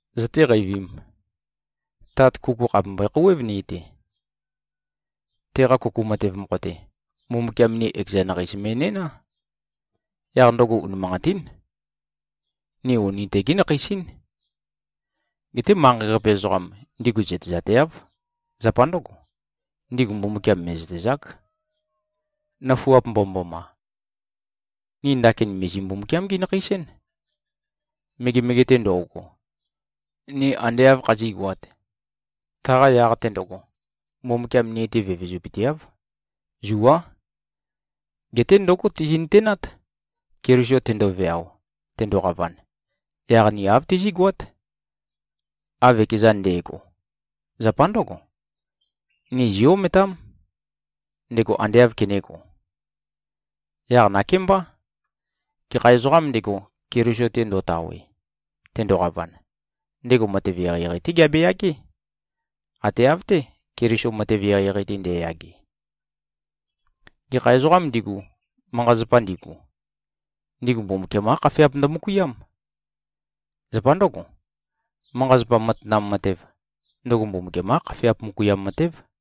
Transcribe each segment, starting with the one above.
Zøtéqeivīm? Tat, kuku khàpe mbøe-khouwév ni-te. Teqa kuku matev mokho-te, Mbumbukiam ni ekeza nakheis mi꞉næná. Yaq ndøgo unimanqatín. Ni uni tegé nakheis-ín. Geté manqei-qape ezoqam, ndigu zøtezateáv. Zapa ndǿgo, ndigu Mbumbukiam mè꞉zøtezák. Nøfuap mbomømboma! Ni ndakin mìzi-Mbumbukiam-gí-nakheis-én. Megemege-te ndo꞉go, ni ande āv khazígoāt, taqa yaq-te ndøgo, Mbumbukiam ni-te vevezupøteáv. Zuá. Geté ndǿgo tizi꞉-nøtenát: Keliso tendoveao, tendoqavan, yaq ni āv tizí꞉goát, av ekezan nde꞉go. Zapa ndǿgo, ni zí-ometám, ndego ande āv kenēgo. Yaq nakémbá, gekha ezoqām ndego, Keliso-te ndo꞉tawe, tendoqavan, ndego matev eqeieqei-té geabeyagé, ate av-té, Keliso matev eqeieqei-te nde꞉yage. Gekha ezoqām ndigu, manqa-zapa ndigu, ndigu Mbumbukiam-qá khafeap ndømøkuiám. Zapa ndǿgo, manqa-zapa matanam matev, ndøgo Mbumbukiam-qá khafeap møkuiam matév.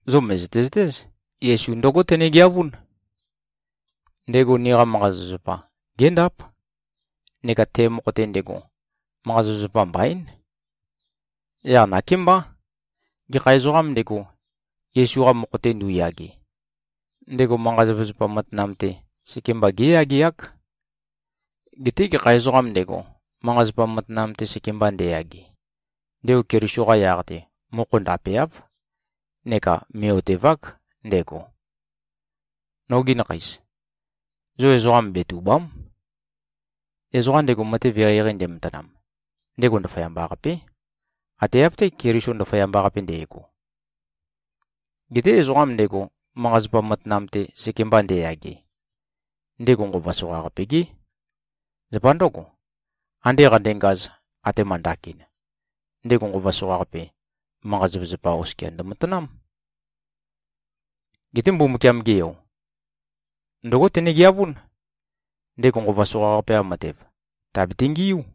Zo mø̀zøte-zøtéz, Yesu ndǿgo tenegeavún: Ndego niqa manqa-zapazapa, géndáp. Neka te mokho-te ndego, manqa-zapazapa mbaín. Yaq nakémbá, gekha ezoqām ndego, Yesu-qa mokho-te ndu꞉yage, ndego manqa-zapazapa matanam-te, sekemba géyageák. Geté gekha ezoqām ndego, manqa-zapa matanam-te sekemba ndeyage, ndego Keliso-qa yaq-te, mokho ndapeáv neka mè꞉-otevák ndego. Nogi nakheis. Zo ezoqa betùba᷄m. Ezoqa ndego matev eqeieqei ndematanam, ndego ndaføyamba-qapé. Ate av-té, Keliso ndaføyamba-qape nde꞉go. Geté ezoqam ndego, manqa-zapa matanam-te sekemba ndeyage, ndego nqova soqaqape-gé. Zapa ndǿgo, ande qandengaz, atema ndakin, ndego nqova soqaqape, manqa-zapazapa oskia ndømatanám. Geté Mbumbukiam-ge Yo, ndǿgo tenegeavún: Ndego nqova soqaqape-qa matev, tèabete-ngiú.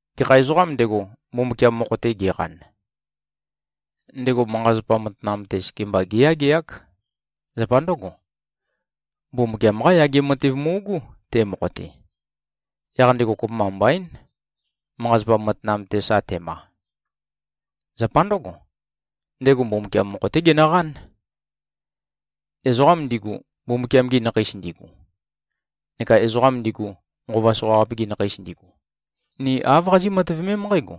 Gekha ezoqām ndego, Mbumbukiam mokho-te geqan, ndego manqa-zapa matanam-te sekemba géyageák. Zapa ndǿgo, Mbumbukiam-qá yage matev mu꞉gú, te mokho-te. Yaq ndego kopømba mbaín, manqa-zapa matanam-te sa tema. Zapa ndǿgo, ndego Mbumbukiam mokho-té genøqán. Ezoqam ndigu, Mbumbukiam-gi nakheis ndigu, neka ezoqam ndigu, nqova soqaqape-gi nakheis ndigu, ni āv qazí꞉-matøvemém nqǽgo: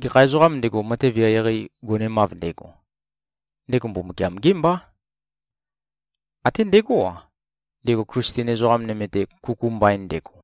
Gekha ezoqām ndego, matev eqeieqei gonemav ndego, ndego Mbumbukiam-gé mbá; até ndegó-a, ndego Klisten ezoqa nøme-te kuku mbain ndego.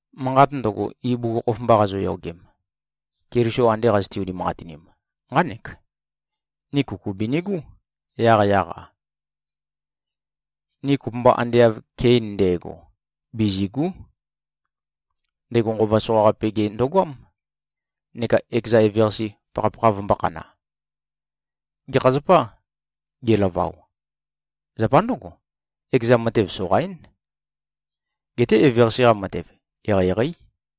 Manqat ndøgo, ibugukhokhof mba qazoyogem, Keliso ande qazøte-unimanqatinim, nqánek: Ni kuku binigú, yaqyaq-a. Ni kopømba ande av Kein nde꞉go, bizìgu᷄. Ndego nqova soqaqape-ge ndøgoám, neka ekeza eveqase pakhapakha vømbō-khana. Gekha zapâ, gelavao? Zapa ndǿgo, ekeza matev soqaín. Geté eveqase-qa matev, eqeieqeí.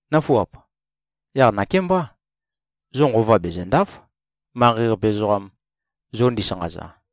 Nǿfuap! Yaq nakémbá, zo nqova bezø̀nda᷄f, manqei-qape ezoqam zo ndisanqaza.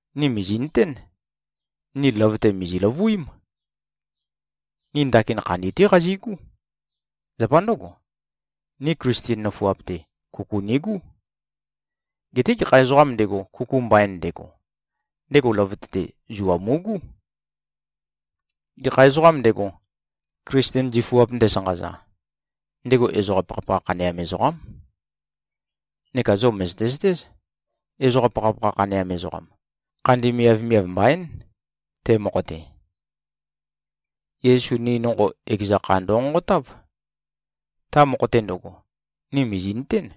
Ni mìzi꞉nøtén: Ni løvøte mìzi-løvuím. Ni ndakin khandi-té qazigú. Zapa ndǿgo, ni Klisten nøfuap-te, kuku nigú. Geté gekha ezoqām ndego, kuku mbain ndego, ndego løvøte-te zua mu꞉gú. Gekha ezoqām ndego, Klisten zifuap ndesanqaza, ndego ezoqa pakhapakha khaneam ezoqám. Neka zo mø̀zøte-zøtéz, ezoqa pakhapakha khaneam ezoqam, khandi miavmiav mbaín, te mokho-te. Yesu ni nonqo, ekeza kha ndønqonqotáv. Ta mokho-te ndøgo, ni mìzi꞉nøtén,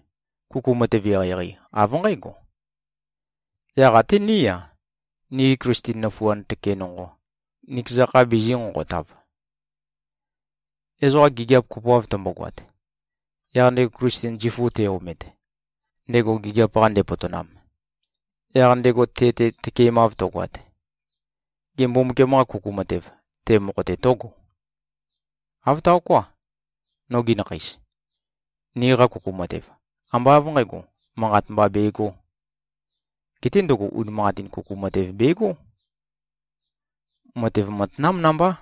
kuku matev eqeieqei, av nqǽgo. Yaq até ní-a, nigi Klisten nøfuand tøke nonqo, nikeza kha bizī-nqonqotav. Ezoqa gigiap kopoav tømbogoat, yaq ndego Klisten zifu te-omet, ndego gigiap-qa ndepotonam, yaq ndego te-te tøkemav tøgoat, gê, Mbumbukiam-qa kuku matev, te mokho-te tǿgo? Āv taoká. Nogi nakheis! Niqa kuku matev, ambá av nqǣgo, manqat mba begō. Geté ndøgo unimanqatin kuku matev begó. Matev matanám nambá.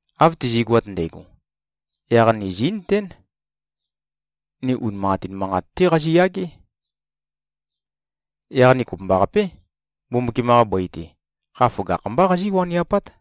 Av tizigoat ndægo, yaq ni zí꞉nøtén, ni unimanqatin manqat-té qaziyagé. Yaq ni kopømbaqapé, Mbumbukiam-qa bøi-te, kha føgakh-mbá qazí-waniapát.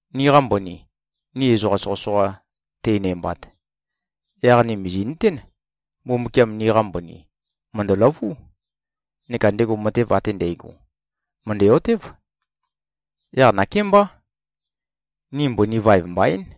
Niqa mbøni, ni ezoqa soqøsoqa tænæmbat, yaq ni mìzi꞉nøtén, Mbumbukiam niqa mbøni mø̀ndøløvú, neka ndego matev ate ndægo, mø̀ndæ-otév. Yaq nakémbá, ni mbøni vaev mbaín.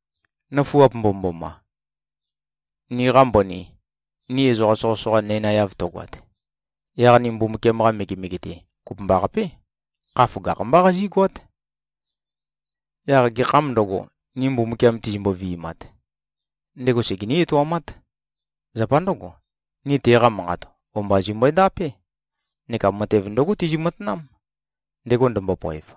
Nøfuap mbomømboma! Niqa mbøni, ni ezoqa soqøsoqa nænaeav tøgoat, yaq ni Mbumbukiam-qa megemege-te, kopømbaqapé, kha føgakh-mbá qazígoát. Yaq gekhām ndøgo, ni Mbumbukiam tizimbo-vi꞉mat, ndego segení-etoumát. Zapa ndǿgo, ni teqa manqat, o-mba zimbøe-ndapé neka matev ndǿgo tizi-matanám, ndego ndømbopoev.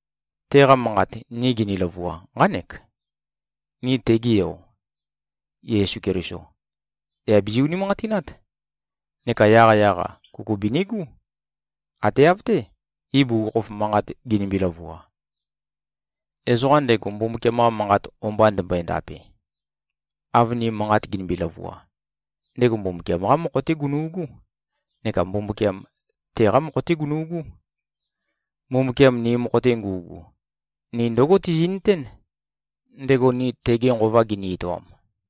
Teqa manqat, ni gini-løvua, nqánek: Ni tege Yo, Yesu Keliso, yà bizi-unimanqatinát, neka yaqyaq-a, kuku binigú, ate av-té, ibugukhokhof manqat ginimbi-løvua. Ezoqa ndego Mbumbukiam-qa Manqat o-mba ndembøe-ndape, av ni manqat ginimbi-løvua, ndego Mbumbukiam-qá mokho-té gunu꞉gú, neka Mbumbukiam, teqá mokho-té gunu꞉gú. Mbumbukiam ni mokho-te ngu꞉gu, ni ndǿgo tizi꞉nøtén, ndego ni tege Nqova gini-etoam.